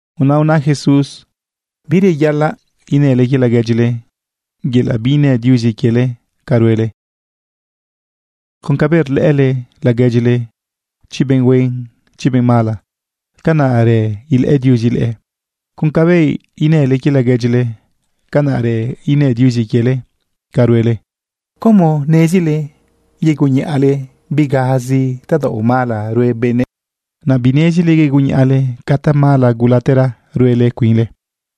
Naꞌ una Jesús: ―Bireyaꞌalaꞌ inële quie laguedyile, yelaꞌ biinë Diuzi quiele ca ruele. Con cabëꞌ rlëꞌële laguedyile, chi benꞌ huen, chi benꞌ mala, canaꞌrë ilëꞌë Diuzi leꞌe. Con cabëꞌ inële quie laguedyile, canaꞌrë inë Diuzi quiele ca ruele. ¿Cómo nezile yegunniꞌale bigazi tadaoꞌ mala rue benëꞌ, naꞌ binezile yegunniꞌale ca tamala gulatera ruele cuinle?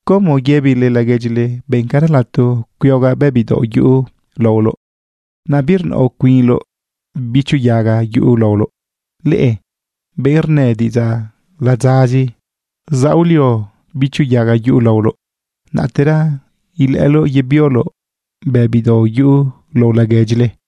¿Cómo yëbile laguedyile: “Bencara lato cuiogaꞌ bëbi daoꞌ yuꞌu laoloꞌ”, naꞌ birnaoꞌ cuinloꞌ bichu yaga yuꞌu laoloꞌ? Leꞌe benꞌ rnë diꞌidzaꞌ ladzazi, zaolio bichu yaga yuꞌu laoloꞌ, naꞌtera ilëꞌëloꞌ yebioloꞌ bëbi daoꞌ yuꞌu lao laguedyile.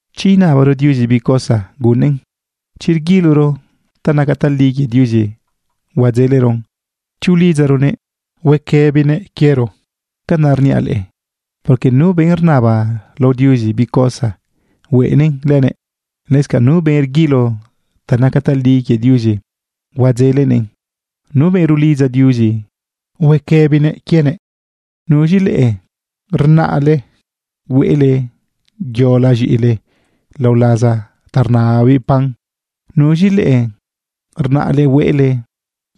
―Chi inabaro Diuzi bi cosa, gunnëꞌn. Chi rguiloro ta naca tali quie Diuzi, huadzeleron. Chi ulidzaronëꞌ, huequëbinëꞌ quiero. Canaꞌ rniaꞌ leꞌe, porque nu benꞌ rnaba lao Diuzi bi cosa, hueꞌnëꞌn lënëꞌ. Lëscanꞌ nu benꞌ rguilo ta naca tali quie Diuzi, huadzelenëꞌn. Nu benꞌ rulidza Diuzi, huequëbinëꞌ quienëꞌ. ¿Nuz̃i leꞌe rnaꞌle hueꞌle yola z̃iꞌile lao laza ta rnababiꞌ pan? ¿Nuz̃i leꞌe rnaꞌle hueꞌle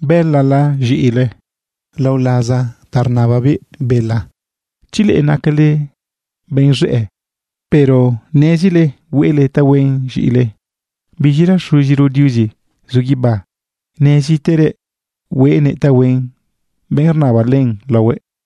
bëlala z̃iꞌile lao laza ta rnababiꞌ bela? Chi leꞌe nacale benꞌ z̃ëꞌë, pero nezile hueꞌle tahuen z̃iꞌile, ¡biz̃ira Xuziro Diuzi zu guibá neziterëꞌ hueꞌnëꞌ tahuen benꞌ rnaba len laohuëꞌ!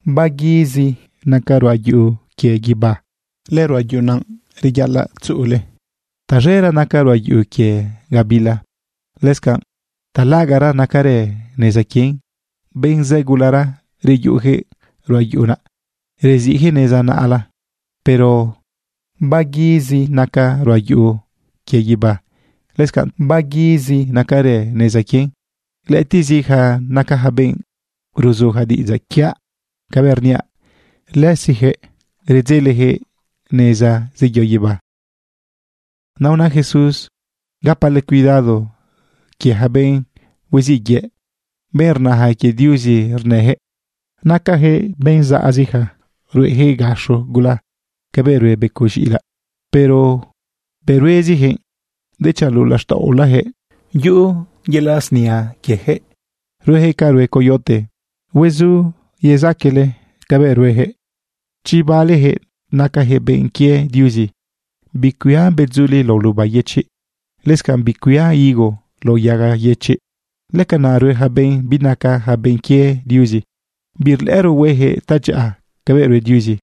―Taguizi naca ruꞌa yuꞌu quie guibá. Lëruꞌa yuꞌu naꞌ reyaꞌalaꞌ tzuꞌule. Taz̃era naca ruꞌa yuꞌu quie gabila. Lëscanꞌ talaꞌagaꞌra nacarë neza quien. Benꞌ zë gulara reyuꞌujëꞌ ruꞌa yuꞌu naꞌ, reziꞌjëꞌ neza naꞌla. Pero taguizi naca ruꞌa yuꞌu quie guibá. Lëscanꞌ taguizi nacarë neza quien. Lëꞌëtiꞌzija naca ja benꞌ ruzuja diꞌidzaꞌ quiaꞌ cabëꞌ rniaꞌ. Lëzijëꞌ redzelejëꞌ neza zeyo guibá. Naꞌ una Jesús: ―Gapale cuidado quie ja benꞌ huiziꞌ yëꞌ, benꞌ rnaja quie Diuzi rnëjëꞌ. Nacajëꞌ benꞌ zaꞌzija ruejëꞌ gaxo gula cabëꞌ rue becoꞌ z̃iꞌilaꞌ. Pero bëꞌ ruezijëꞌ, dechanꞌ luꞌu laxtaꞌolajëꞌ yuꞌu yelaꞌ snia quiejëꞌ, ruejëꞌ ca rue coyote. Huezuyezaquele cabëꞌ ruejëꞌ chi balejëꞌ nacajëꞌ benꞌ quie Diuzi. Bicuia bedzuliꞌ lao luba yëchiꞌ. Lëscanꞌ bicuia higo lao yaga yëchiꞌ. Lëcanaꞌ rue ja benꞌ binaca ja benꞌ quie Diuzi. Birlëꞌëro huejëꞌ tadyaꞌa cabëꞌ rue Diuzi.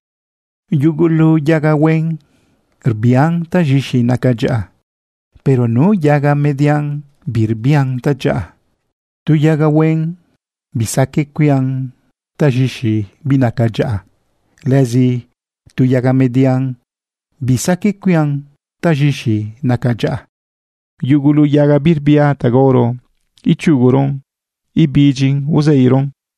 Yugulu yaga huen rbian taz̃ixi naca dyaꞌa, pero nu yaga median, birbian tadyaꞌa. Tu yaga huen bisaqueꞌ cuian taz̃ixi binaca dyaꞌa. Lëzi tu yaga median bisaqueꞌ cuian taz̃ixi naca dyaꞌa. Yugulu yaga birbia ta gaoro ichuguron ibidyin uzeiron.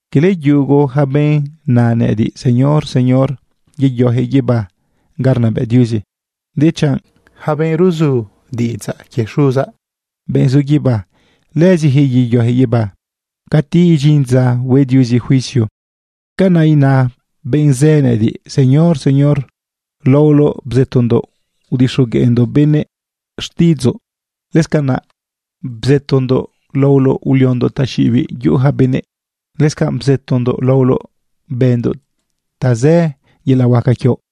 ―Quele yugu ja benꞌ na nëꞌëdiꞌ: “Señor, Señor”, yeyojëꞌ guibá ga rnabëꞌ Diuzi, dechanꞌ yaca benꞌ ruzu diꞌidzaꞌ quie Xuzaꞌ, benꞌ zu guibá, lëzijëꞌ yeyojëꞌ guibá. Cati idyin dza hue Diuzi juicio, canaꞌ ina benꞌ zë nëꞌëdiꞌ: “Señor, Señor, laoloꞌ bzëtondoꞌ udixogueꞌndoꞌ benëꞌ xtiꞌidzoꞌ. Lëscanaꞌ bzëtondoꞌ laoloꞌ uliondoꞌ taxiꞌibiꞌ yuꞌu ja benëꞌ. Lëscanꞌ bzëtondoꞌ laoloꞌ bëndoꞌ tazë yelaꞌ huaca quioꞌ.”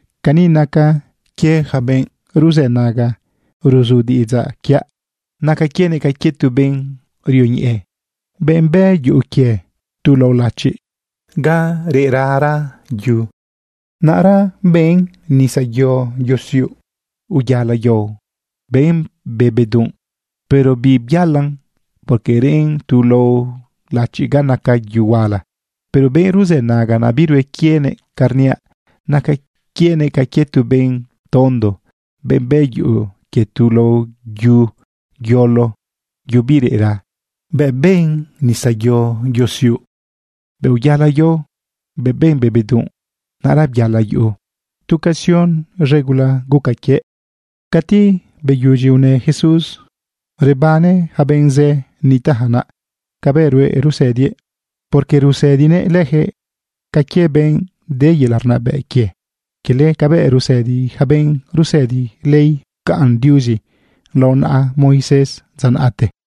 ―Cani nacan quie yaca benꞌ ruzënaga ruzu diꞌidzaꞌ quiaꞌ. Naca quienëꞌ ca quie tu benꞌ rioñeꞌe, benꞌ bë yuꞌu quie tu lao lachiꞌ ga reꞌrara yu. Naꞌra ben nisa yosiuꞌ, uyala yao, ben be bedunꞌ, pero bibyalan, porque reꞌn tu lao lachiꞌ ga naca yu huala. Pero benꞌ ruzënaga, naꞌ birue quienëꞌ ca rniaꞌ, naca quienëꞌ ca quie tu benꞌ tondo, benꞌ bë yuꞌu quie tu lao yu yolo, yu bireꞌra. Bëꞌ ben nisa yosiuꞌ, bëꞌ uyala yao, bëꞌ ben be bedunꞌ, naꞌra byala yuꞌu. Tu casion z̃e gula guca quiëꞌ. Cati beyudyi unë Jesús, rebane ja benꞌ zë nitaꞌja naꞌ cabëꞌ ruëꞌ rusëdiëꞌ. Porque rusëdinëꞌ lëjëꞌ ca quie benꞌ de yelaꞌ rnabëꞌ quie, quele cabëꞌ rusëdi ja benꞌ rusëdi ley pcaꞌn Diuzi lao naꞌa Moisés dza naꞌte.